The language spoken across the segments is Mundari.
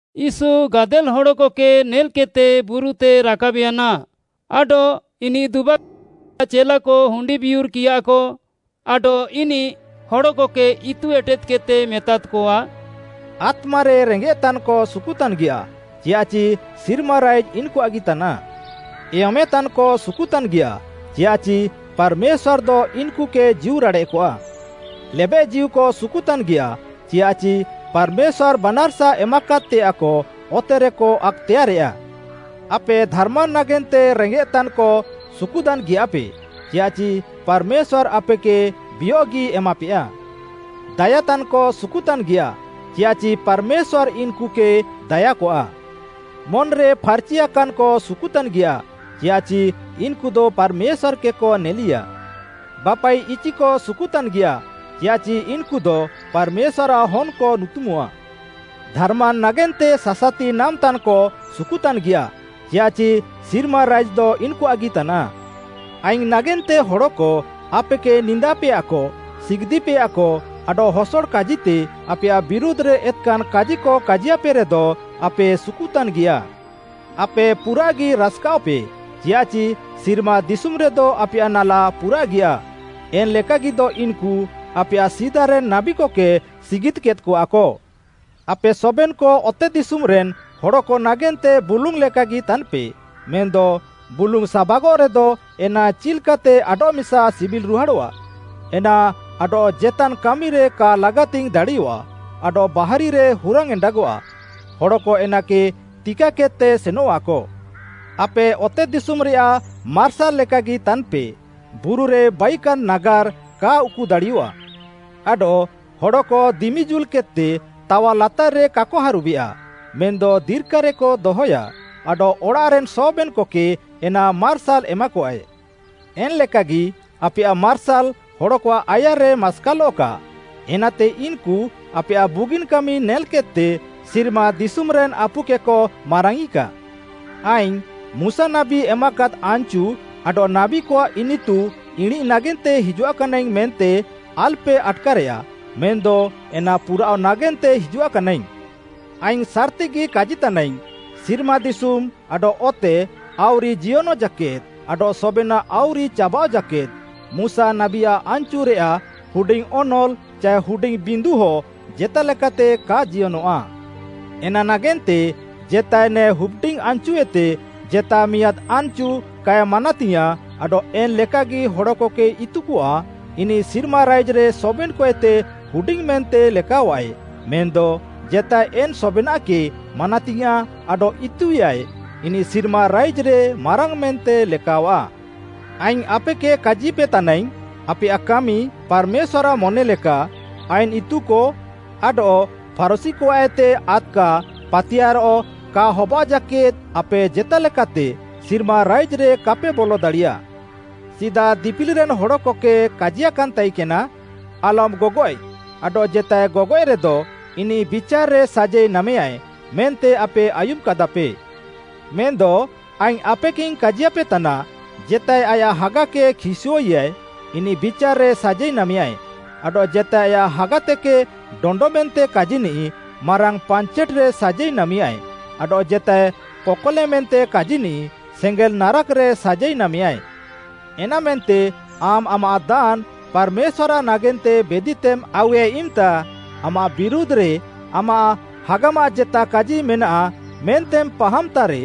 ୟୀଶୁ ଗାଦେଲ୍‌ ହଡ଼କକେ ନେଲ୍‌କେଦ୍‌ତେ ବୁରୁତେ ରାକାବ୍‌ୟାନା ଆଡଃ ଇନିଃ ଦୁବାକାନ୍‌ତାଃ ଆୟାଃ ଚେଲାକ ହୁଣ୍ଡିବିୟୁର୍‌କିୟାକ, ଆଡଃ ଇନିଃ ହଡ଼କକେ ଇତୁ ଏଟେଦ୍‌କେଦ୍‌ତେ ମେତାଦ୍‌କଆ, “ଆତ୍ମାରେ ରେଙ୍ଗେଃତାନ୍‌କ ସୁକୁତାନ୍‌ଗିୟାଃ; ଚିୟାଃଚି ସିର୍ମା ରାଇଜ୍‌ ଇନ୍‌କୁଆଃଗି ତାନାଃ! ଏୟମେଁତାନ୍‌କ ସୁକୁତାନ୍‌ଗିୟାଃ; ଚିୟାଃଚି ପାର୍‌ମେଶ୍ୱାର୍‌ଦ ଇନ୍‌କୁକେ ଜୀଉରାଡ଼େଃକଆ! ଲେବେଃଜୀଉକ ସୁକୁତାନ୍‌ଗିୟାଃ; ଚିୟାଃଚି ପାର୍‌ମେଶ୍ୱାର୍‌ ବାନାର୍‌ସା ଏମାକାଦ୍‌ତେୟାଃକ ଅତେରେକ ଆକ୍‌ତେୟାର୍‌ରେୟା। ଆପେ ଧାର୍‌ମାନ୍‌ ନାଗେନ୍ତେ ରେଙ୍ଗେଃତାନ୍‌କ, ସୁକୁତାନ୍‌ ଗିୟାଃପେ; ଚିୟାଃଚି ପାର୍‌ମେଶ୍ୱାର୍‌ ଆପେକେ ବିୟଃଗି ଏମାପେୟା! ଦାୟାତାନ୍‌କ ସୁକୁତାନ୍‌ଗିୟାଃ; ଚିୟାଃଚି ପାର୍‌ମେଶ୍ୱାର୍‌ ଇନ୍‌କୁକେ ଦାୟାକଆ! ମନ୍‌ରେ ଫାର୍‌ଚିଆକାନ୍‌କ ସୁକୁତାନ୍‌ଗିୟାଃ; ଚିୟାଃଚି ଇନ୍‌କୁଦ ପାର୍‌ମେଶ୍ୱାର୍‌କେକ ନେଲିୟା! ବାପାଇଚିକ ସୁକୁତାନ୍‌ଗିୟାଃ; ଚିୟାଃଚି ଇନ୍‌କୁଦ ପାର୍‌ମେଶ୍ୱାର୍‌ଆଃ ହନ୍‌କ ନୁତୁମଃଆ! ଧାର୍‌ମାନ୍‌ ନାଗେନ୍ତେ ସାସାତି ନାମ୍‌ତାନ୍‌କ ସୁକୁତାନ୍‌ଗିୟାଃ; ଚିୟାଃଚି ସିର୍ମା ରାଇଜ୍‌ଦ ଇନ୍‌କୁଆଃଗି ତାନାଃ! “ଆଇଙ୍ଗ୍‌ ନାଗେନ୍ତେ ହଡ଼କ ଆପେକେ ନିନ୍ଦାପେୟାକ, ସିଗିଦ୍‍ପେୟାକ, ଆଡଃ ହସଡ଼ କାଜିତେ ଆପେୟାଃ ବିରୁଧ୍‌ରେ ଏତ୍‌କାନ୍‌ କାଜିକ କାଜିୟାପେରେଦ, ଆପେ ସୁକୁତାନ୍‌ଗିୟାଃ। ଆପେ ପୁରାଃଗି ରାସ୍‌କାଅଃପେ, ଚିୟାଃଚି ସିର୍ମା ଦିଶୁମ୍‌ରେଦ ଆପେୟାଃ ନାଲା ପୁରାଃଗିୟା, ଏନ୍‌ ଲେକାଗିଦ ଇନ୍‌କୁ ଆପେୟାଃ ସିଦାରେନ୍‌ ନାବୀକକେ ସିଗିଦ୍‌କେଦ୍‌କଆକ। “ଆପେ ସବେନ୍‌କ ଅତେଦିଶୁମ୍‌ରେନ୍‌ ହଡ଼କ ନାଗେନ୍ତେ ବୁଲୁଙ୍ଗ୍‌ ଲେକାଗି ତାନ୍‌ପେ, ମେନ୍‌ଦ ବୁଲୁଙ୍ଗ୍‌ ସାବାଗଃରେଦ ଏନା ଚିଲ୍‌କାତେ ଆଡଃମିସା ସିବିଲ୍‌ରୁହାଡ଼ଃଆ? ଏନା ଆଡଃ ଜେତାନ୍‌ କାମିରେ କା ଲାଗାତିଙ୍ଗ୍‌ ଦାଡ଼ିୟଃଆ ଆଡଃ ବାହାରିରେ ହୁରାଙ୍ଗ୍‌ ଏଣ୍ଡାଗଃଆ। ହଡ଼କ ଏନାକେ ତିକାକେଦ୍‌ତେ ସେନଃଆକ। “ଆପେ ଅତେଦିଶୁମ୍‌ରେୟାଃ ମାର୍ସାଲ୍‌ ଲେକାଗି ତାନ୍‌ପେ। ବୁରୁରେ ବାଇକାନ୍‌ ନାଗାର୍‌ କା ଉକୁଦାଡ଼ିୟଃଆ। ଆଡଃ ହଡ଼କ ଦିମି ଜୁଲ୍‌କେଦ୍‌ତେ ତାୱାଲାତାର୍‌ରେ କାକ ହାରୁବେୟା ମେନ୍‌ଦ ଦିର୍କାରେକ ଦହୟା, ଆଡଃ ଅଡ଼ାଃରେନ୍‌ ସବେନ୍‌କକେ ଏନା ମାର୍ସାଲ୍‌ ଏମାକଆଏ। ଏନ୍‌ ଲେକାଗି ଆପେୟାଃ ମାର୍ସାଲ୍‌ ହଡ଼କଆଃ ଆୟାର୍‌ରେ ମାସ୍କାଲଃକା, ଏନାତେ ଇନ୍‌କୁ ଆପେୟାଃ ବୁଗିନ୍‌ କାମି ନେଲ୍‌କେଦ୍‌ତେ ସିର୍ମା ଦିଶୁମ୍‌ରେନ୍‌ ଆପୁକେକ ମାରାଙ୍ଗ୍‌ଇକା। “ଆଇଙ୍ଗ୍‌ ମୁଶା ନାବୀ ଏମାକାଦ୍‌ ଆନ୍‌ଚୁ ଆଡଃ ନାବୀକଆଃ ଇନିତୁ ଇଣିଁଃ ନାଗେନ୍ତେ ହିଜୁଆକାନାଇଙ୍ଗ୍‌ ମେନ୍ତେ ଆଲ୍‌ପେ ଆଟ୍‌କାରେୟା, ମେନ୍‌ଦ ଏନା ପୁରାଅଃ ନାଗେନ୍ତେ ହିଜୁଆକାନାଇଙ୍ଗ୍‌। ଆଇଙ୍ଗ୍‌ ସାର୍‌ତିଗି କାଜିତାନାଇଙ୍ଗ୍‌, ସିର୍ମା ଦିଶୁମ୍‌ ଆଡଃ ଅତେ ଆଉରି ଜିୟନଃ ଜାକେଦ୍‌ ଆଡଃ ସବେନାଃ ଆଉରି ଚାବାଃଅ ଜାକେଦ୍‌, ମୁଶା ନାବୀଆଃ ଆନ୍‌ଚୁରେୟାଃ ହୁଡିଙ୍ଗ୍‌ ଅନଲ୍‌ ଚାଏ ହୁଡିଙ୍ଗ୍‌ ବିନ୍ଧୁହ ଜେତାଲେକାତେ କା ଜିୟନଃଆ। ଏନା ନାଗେନ୍ତେ ଜେତାଏ ନେ ହୁପ୍‌ଡିଙ୍ଗ୍‌ ଆନ୍‍ଚୁଏତେ ଜେତା ମିଆଁଦ୍‌ ଆନ୍‌ଚୁ କାଏ ମାନାତିୟାଁଃ ଆଡଃ ଏନ୍‌ ଲେକାଗି ହଡ଼କକେ ଇତୁକଆ, ଇନିଃ ସିର୍ମା ରାଇଜ୍‌ରେ ସବେନ୍‌କଏତେ ହୁଡିଙ୍ଗ୍‌ ମେନ୍ତେ ଲେକାଅଃଆଏ ମେନ୍‌ଦ ଜେତାଏ ଏନ୍‌ ସବେନାଃକେ ମାନାତିୟାଁଃ ଆଡଃ ଇତୁଆଃଏ, ଇନିଃ ସିର୍ମା ରାଇଜ୍‌ରେ ମାରାଙ୍ଗ୍‌ ମେନ୍ତେ ଲେକାଅଃଆ। ଆଇଙ୍ଗ୍‌ ଆପେକେ କାଜିପେତାନାଇଙ୍ଗ୍‌, ଆପେୟାଃ କାମି ପାର୍‌ମେଶ୍ୱାର୍‌ଆଃ ମନେ ଲେକା, ଆଇନ୍‌ ଇତୁକ ଆଡଃ ଫାରୁଶୀକଆଃଏତେ ଆଦ୍‌କା ପାତିୟାର୍‌ କା ହବାଅଃ ଜାକେଦ୍‌ ଆପେ ଜେତାଲେକାତେ ସିର୍ମା ରାଇଜ୍‌ରେ କାପେ ବଲ ଦାଡ଼ିୟାଃ। “ସିଦା ଦିପିଲିରେନ୍‌ ହଡ଼କକେ କାଜିୟାକାନ୍‌ ତାଇକେନା, ‘ଆଲମ୍‌ ଗଗଏଃ ଆଡଃ ଜେତାଏ ଗଗଏଃରେଦ, ଇନିଃ ବିଚାର୍‌ରେ ସାଜାଇ ନାମେୟାଏ’ ମେନ୍ତେ ଆପେ ଆୟୁମ୍‌କାଦାପେ। ମେନ୍‌ଦ ଆଇଙ୍ଗ୍‌ ଆପେକେଇଙ୍ଗ୍‌ କାଜିୟାପେତାନା, ଜେତାଏ ଆୟାଃ ହାଗାକେ ଖିସ୍‌ଅଃଆଏ, ଇନିଃ ବିଚାର୍‌ରେ ସାଜାଇ ନାମେୟାଏ। ଆଡଃ ଜେତାଏ ଆୟାଃ ହାଗାତେକେ ଡଣ୍ଡ ମେନ୍ତେ କାଜିନିଃ ମାରାଙ୍ଗ୍‌ ପାଞ୍ଚେଟ୍‌ରେ ସାଜାଇ ନାମେୟାଏ, ଆଡଃ ଜେତାଏ କକଲେ ମେନ୍ତେ କାଜିନିଃ ସେଙ୍ଗେଲ୍‌ ନାରାକ୍‌ରେ ସାଜାଇ ନାମେୟାଏ। ଏନାମେନ୍ତେ ଆମ୍‌ ଆମାଃ ଦାନ୍‌ ପାର୍‌ମେଶ୍ୱାର୍‌ଆଃ ନାଗେନ୍ତେ ବେଦିତେମ୍‌ ଆଉୱେ ଇମ୍‌ତା ଆମାଃ ବିରୁଧ୍‌ରେ ଆମାଃ ହାଗାମାଃ ଜେତା କାଜି ମେନାଃ ମେନ୍ତେମ୍‌ ପାହାମ୍‌ତାରେ,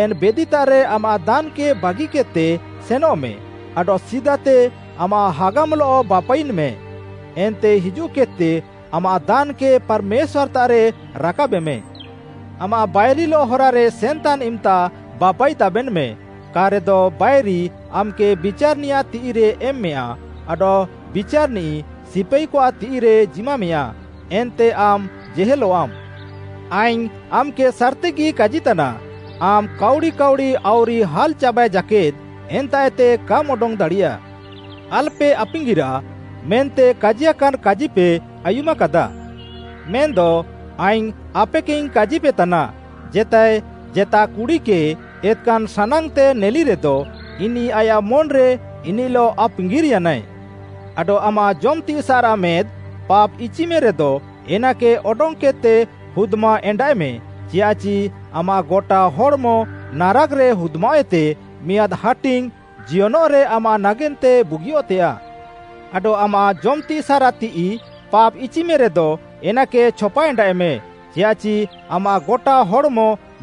ଏନ୍‌ ବେଦିତାଃରେ ଆମାଃ ଦାନ୍‌କେ ବାଗିକେଦ୍‌ତେ ସେନଃମେ ଆଡଃ ସିଦାତେ ଆମାଃ ହାଗାମ୍‌ଲଃ ବାପାଇୟେନ୍‌ମେ, ଏନ୍ତେ ହିଜୁଃକେଦ୍‌ତେ ଆମାଃ ଦାନ୍‌କେ ପାର୍‌ମେଶ୍ୱାର୍‌ତାଃରେ ରାକାବେମେ। “ଆମାଃ ବାଇରିଲଃ ହରାରେ ସେନ୍‌ତାନ୍‌ ଇମ୍‌ତା ବାପାଇଦାବେନ୍‌ମେ, କା'ରେଦ ବାଇରି ଆମ୍‌କେ ବିଚାର୍‌ନିୟାଃ ତିଃଇରେ ଏମ୍‌ମେୟା, ଆଡଃ ବିଚାର୍‌ନିଃ ସିପାଇକଆଃ ତିଃଇରେ ଜିମାମେଁୟା, ଏନ୍ତେ ଆମ୍‌ ଜେହେଲଃଆମ୍‌। ଆଇଙ୍ଗ୍‌ ଆମ୍‌କେ ସାର୍‌ତିଗି କାଜିତାନା, ଆମ୍‌ କାଉଡ଼ି କାଉଡ଼ି ଆଉରି ହାଲ୍‌ଚାବାଏ ଜାକେଦ୍‌ ଏନ୍ତାଃଏତେ କାମ୍‌ ଅଡଙ୍ଗ୍‌ ଦାଡ଼ିୟା। “ଆଲ୍‌ପେ ଆପାଙ୍ଗିରାଃ, ମେନ୍ତେ ‘କାଜିୟାକାନ୍‌ କାଜିପେ ଆୟୁମାକାଦାଃ।’ ମେନ୍‌ଦ ଆଇଙ୍ଗ୍‌ ଆପେକେଇଙ୍ଗ୍‌ କାଜିପେତାନା, ଜେତାଏ ଜେତା କୁଡ଼ିକେ ଏତ୍‍କାନ୍‌ ସାନାଙ୍ଗ୍‌ତେ ନେଲିରେଦ ଇନିଃ ଆୟାଃ ମନ୍‌ରେ ଇନିଃଲଃ ଆପାଙ୍ଗିର୍‌ୟାନାଏ। ଆଡଃ ଆମାଃ ଜମ୍‌ତିସାଃରାଃ ମେଦ୍‌ ପାପ୍‌ଇଚିମେରେଦ, ଏନାକେ ଅଡଙ୍ଗ୍‌କେଦ୍‌ତେ ହୁଦ୍‌ମାଏଣ୍ଡାଃଏମେ, ଚିୟାଃଚି ଆମାଃ ଗଟା ହଡ଼୍‌ମ ନାରାକ୍‌ରେ ହୁଦ୍‌ମାଅଃଏତେ ମିଆଁଦ୍‌ ହାଟିଙ୍ଗ୍‌ ଜିୟନଃରେ ଆମାଃ ନାଗେନ୍ତେ ବୁଗିଅଃତେୟାଃ। ଆଡଃ ଆମାଃ ଜମ୍‌ତିସାଃରାଃ ତିଃଇ ପାପ୍‌ଇଚିମେରେଦ, ଏନାକେ ଛପାଏଣ୍ଡାଃଏମେ, ଚିୟାଃଚି ଆମାଃ ଗଟା ହଡ଼୍‌ମ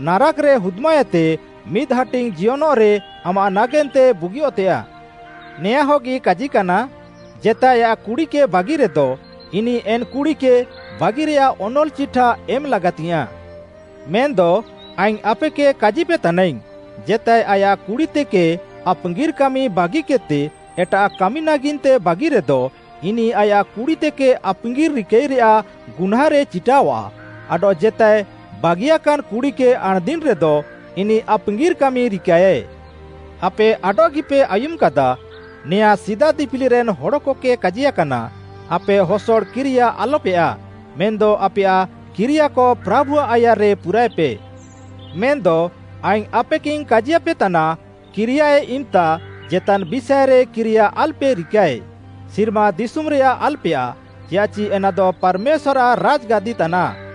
ନାରାକ୍‌ରେ ହୁଦ୍‌ମାଅଃଏତେ, ମିଦ୍‌ ହାଟିଙ୍ଗ୍‌ ଜିୟନଃରେ ଆମାଃ ନାଗେନ୍ତେ ବୁଗିଅଃତେୟାଃ। “ନେଆଁଁହଗି କାଜିକାନା, ‘ଜେତାଏ ଆୟାଃ କୁଡ଼ିକେ ବାଗିରେଦ, ଇନିଃ ଏନ୍‌ କୁଡ଼ିକେ ବାଗିରେଆଃ ଅନଲ୍‌ଚିଠା ଏମ୍‌ ଲାଗାତିଙ୍ଗ୍‌ୟାଁଃ।’ ମେନ୍‌ଦ ଆଇଙ୍ଗ୍‌ ଆପେକେ କାଜିପେତାନାଇଙ୍ଗ୍‌, ଜେତାଏ ଆୟାଃ କୁଡ଼ିତେକେ ଆପାଙ୍ଗିର୍‌ କାମି ବାଗିକେଦ୍‌ତେ ଏଟାଃ କାମି ନାଗେନ୍ତେ ବାଗିରେଦ, ଇନିଃ ଆୟାଃ କୁଡ଼ିତେକେ ଆପାଙ୍ଗିର୍‌ ରିକାଇରେୟାଃ ଗୁହ୍ନାଁରେ ଚିଟାଃୱା ଆଡଃ ଜେତାଏ ବାଗିୟାକାନ୍‌ କୁଡ଼ିକେ ଆଣ୍‌ଦିନ୍‌ରେଦ, ଇନିଃ ଆପାଙ୍ଗିର୍‌ କାମି ରିକାଃଏ। “ଆପେ ଆଡଃଗିପେ ଆୟୁମ୍‌କାଦା, ନେଆଁଁ ସିଦା ଦିପିଲିରେନ୍‌ ହଡ଼କକେ କାଜିୟାକାନା, ‘ଆପେ ହସଡ଼ କିରିୟା ଆଲ୍‌ପେୟାଃ, ମେନ୍‌ଦ ଆପେୟାଃ କିରିୟାକ ପ୍ରାଭୁଆଃ ଆୟାର୍‌ରେ ପୁରାଏପେ।’ ମେନ୍‌ଦ ଆଇଙ୍ଗ୍‌ ଆପେକେଇଙ୍ଗ୍‌ କାଜିୟାପେତାନା, କିରିୟାଏ ଇମ୍‌ତା ଜେତାନ୍‌ ବିଷାଏରେ କିରିୟା ଆଲପେ ରିକାଏ, ସିର୍ମା ଦିଶୁମ୍‌ରେୟାଃ ଆଲ୍‌ପେୟାଃ, ଚିୟାଃଚି ଏନାଦ ପାର୍‌ମେଶ୍ୱାର୍‌ଆଃ ରାଜ୍‌ଗାଦି ତାନାଃ,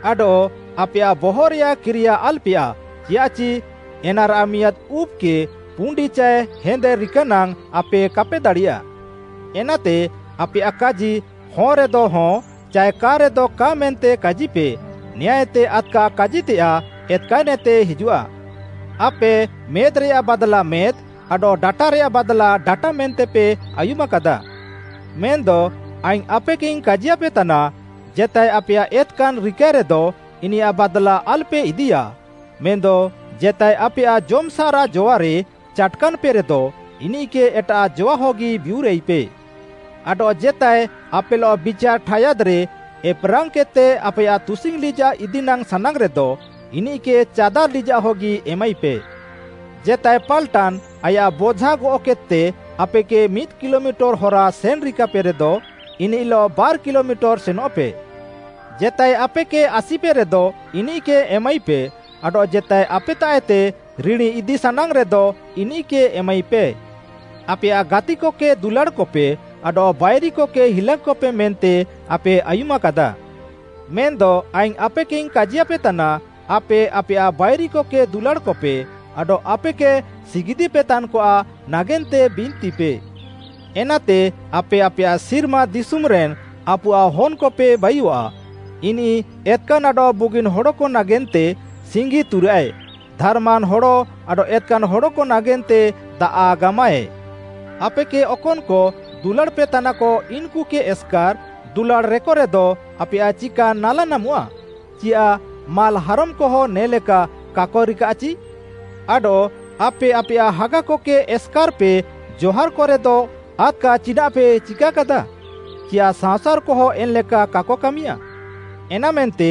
ଆଡଃ ଆପେୟାଃ ବହଃରେୟାଃ କିରିୟା ଆଲ୍‌ପେୟାଃ, ଚିୟାଃଚି ଏନାରାଃ ମିଆଁଦ୍‌ ଉବ୍‌କେ ପୁଣ୍ଡି ଚାଏ ହେନ୍‌ଦେ ରିକାନାଙ୍ଗ୍‌ ଆପେ କାପେ ଦାଡ଼ିୟା। ଏନାତେ ଆପେୟାଃ କାଜି ‘ହଁ ରେଦ ହଁ’ ଚାଏ ‘କା ରେଦ କା’ ମେନ୍ତେ କାଜିପେ, ନେଆଁଁଏତେ ଆଦ୍‌କା କାଜିତେୟାଃ ଏତ୍‌କାନ୍‌ଏତେ ହିଜୁଃଆ। “‘ଆପେ ମେଦ୍‌ରେଆଃ ବାଦ୍‌ଲା ମେଦ୍‌, ଆଡଃ ଡାଟାରେୟାଃ ବାଦ୍‌ଲା ଡାଟା ମେନ୍ତେପେ ଆୟୁମାକାଦାଃ।’ ମେନ୍‌ଦ ଆଇଙ୍ଗ୍‌ ଆପେକେଇଙ୍ଗ୍‌ କାଜିୟାପେତାନା, ଜେତାଏ ଆପେୟାଃ ଏତ୍‌କାନ୍‌ ରିକାଏରେଦ, ଇନିୟାଃ ବାଦ୍‌ଲା ଆଲ୍‌ପେ ଇଦିୟା, ମେନ୍‌ଦ ଜେତାଏ ଆପେୟାଃ ଜମ୍‌ସାଃରାଃ ଜୱାରେ ଚାଟ୍‌କାନ୍‌ପେରେଦ, ଇନିଃକେ ଏଟାଃ ଜୱାହଗି ବିୟୁରାଇପେ। ଆଡଃ ଜେତାଏ ଆପେଲଃ ବିଚାର୍‌ ଠାୟାଦ୍‌ରେ ଏପ୍‌ରାଙ୍ଗ୍‌କେଦ୍‌ତେ ଆପେୟାଃ ତୁସିଙ୍ଗ୍‌ ଲିଜାଃ ଇଦିନାଙ୍ଗ୍‌ ସାନାଙ୍ଗ୍‌ରେଦ, ଇନିଃକେ ଚାଦାର୍‌ ଲିଜାଃ ହଗି ଏମାଇପେ। ଜେତାଏ ପାଲ୍‌ଟାନ୍‌ ଆୟାଃ ବୋଝା ଗଅଃକେଦ୍‌ତେ ଆପେକେ ମିଦ୍‌ କିଲୋମିଟର୍‌ ହରା ସେନ୍‌ ରିକାପେରେଦ, ଇନିଃଲଃ ବାର୍‌ କିଲୋମିଟର୍‌ ସେନଃପେ। ଜେତାଏ ଆପେକେ ଆସିପେରେଦ ଇନିଃକେ ଏମାଇପେ, ଆଡଃ ଜେତାଏ ଆପେତାଃଏତେ ରିଣୀ ଇଦି ସାନାଙ୍ଗ୍‌ରେଦ ଇନିଃକେ ଏମାଇପେ। “‘ଆପେୟାଃ ଗାତିକକେ ଦୁଲାଡ଼୍‌କପେ ଆଡଃ ବାଇରିକକେ ହିଲାଙ୍ଗ୍‌କପେ ମେନ୍ତେ ଆପେ ଆୟୁମାକାଦାଃ।’ ମେନ୍‌ଦ ଆଇଙ୍ଗ୍‌ ଆପେକେଇଙ୍ଗ୍‌ କାଜିୟାପେତାନା, ଆପେ ଆପେୟାଃ ବାଇରିକକେ ଦୁଲାଡ଼୍‌କପେ ଆଡଃ ଆପେକେ ସିଗିଦ୍‍ପେତାନ୍‌କଆଃ ନାଗେନ୍ତେ ବିନ୍ତିପେ। ଏନାତେ ଆପେ ଆପେୟାଃ ସିର୍ମା ଦିଶୁମ୍‌ରେନ୍‌ ଆପୁଆଃ ହନ୍‌କପେ ବାଇୟଃଆ, ଇନିଃ ଏତ୍‌କାନ୍‌ ଆଡଃ ବୁଗିନ୍‌ ହଡ଼କ ନାଗେନ୍ତେ ସିଙ୍ଗି ତୁରାଃଏ, ଧାର୍‌ମାନ୍‌ ହଡ଼ ଆଡଃ ଏତ୍‌କାନ୍‌ ହଡ଼କ ନାଗେନ୍ତେ ଦାଆଃ ଗାମାଃଏ। ଆପେକେ ଅକନ୍‌କ ଦୁଲାଡ଼୍‌ପେତାନାକ ଇନ୍‌କୁକେ ଏସ୍‌କାର୍‌ ଦୁଲାଡ଼୍‌ରେକରେଦ ଆପେୟାଃ ଚିକାନ୍‌ ନାଲା ନାମଃଆ? ଚିୟାଃ ମାଲ୍‌ହାରମ୍‌କହଁ ନେ'ଲେକା କାକ ରିକାଃଚି? ଆଡଃ ଆପେ ଆପେୟାଃ ହାଗାକକେ ଏସ୍‌କାର୍‌ପେ ଜହାର୍‌କ ରେଦ, ଆଦ୍‌କା ଚିନାଃପେ ଚିକାକାଦା? ଚିୟାଃ ସାଅଁସାର୍‌କହଁ ଏନ୍‌ଲେକା କାକ କାମିୟାଃ? ଏନାମେନ୍ତେ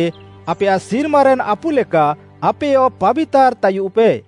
ଆପେୟାଃ ସିର୍ମାରେନ୍‌ ଆପୁ ଲେକା ଆପେୟ ପାବିତାର୍‌ ତାୟୁଃପେ।